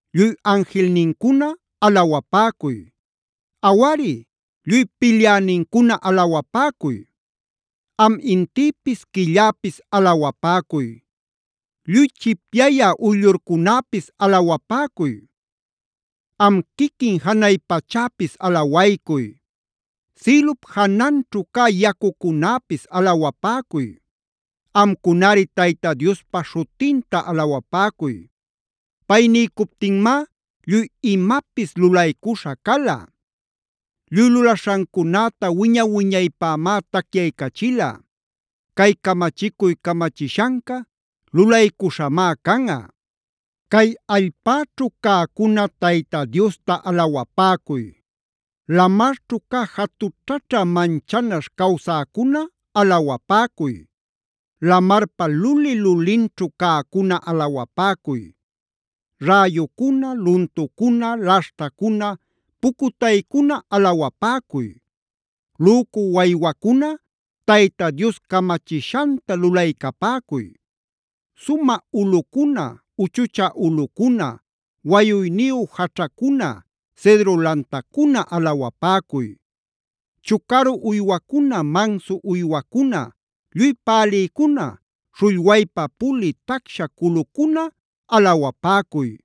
Lluy anjilnincuna alawapäcuy. Awari, lluy pilyänincuna alawapäcuy. Am intïpis quilläpis alawapäcuy. Lluy chipyayä uyllurcunäpis alawapäcuy. Am quiquin janay pachäpis alawaycuy. Sïlup jananćhu cä yacucunäpis alawapäcuy. Amcunari Tayta Diospa śhutinta alawapäcuy. Pay niycuptinmá lluy imapis lulaycuśha cala. Lluy lulaśhancunäta wiña-wiñaypämá tacyaycachila. Cay camachicuy camachishanca lulaycuśhamá canꞌa. Cay allpäćhu cäcuna Tayta Diosta alawapäcuy. Lamarćhu cä jatućhaćha manchanaśh cawsäcuna alawapäcuy. Lamarpa luli-lulinćhu cäcuna alawapäcuy. Räyucuna, luntucuna, laśhtacuna, pucutaycuna alawapäcuy. Lücu waywacuna Tayta Dios camachishanta lulaycapäcuy. Sumä ulꞌucuna, uchuchä ulꞌucuna, wayuyniyu jaćhacuna, cedro lantacuna alawapäcuy. Chucaru uywacuna, mansu uywacuna, lluy pälïcuna, śhullwaypa pulï tacsha culucuna alawapäcuy.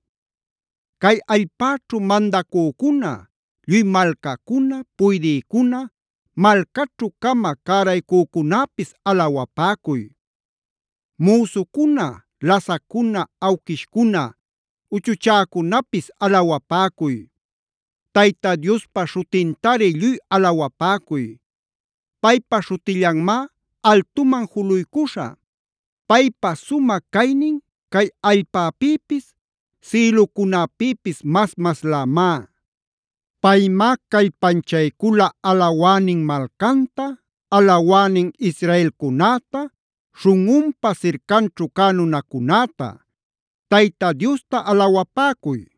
Cay allpäćhu mandacücuna, lluy malcacuna, puydïcuna, malcaćhu-cama cäraycücunäpis alawapäcuy. Müsucuna, lasaccuna, awquishcuna, uchuchäcunäpis alawapäcuy. Tayta Diospa śhutintari lluy alawapäcuy. Paypa śhutillanmá altuman juluycuśha. Paypa sumä caynin cay allpäpïpis sïlucunäpïpis mas-maslämá. Paymá callpanchaycula alawänin malcanta, alawänin Israelcunäta, śhunꞌunpa sircanćhu cä nunacunäta. ¡Tayta Diosta alawapäcuy!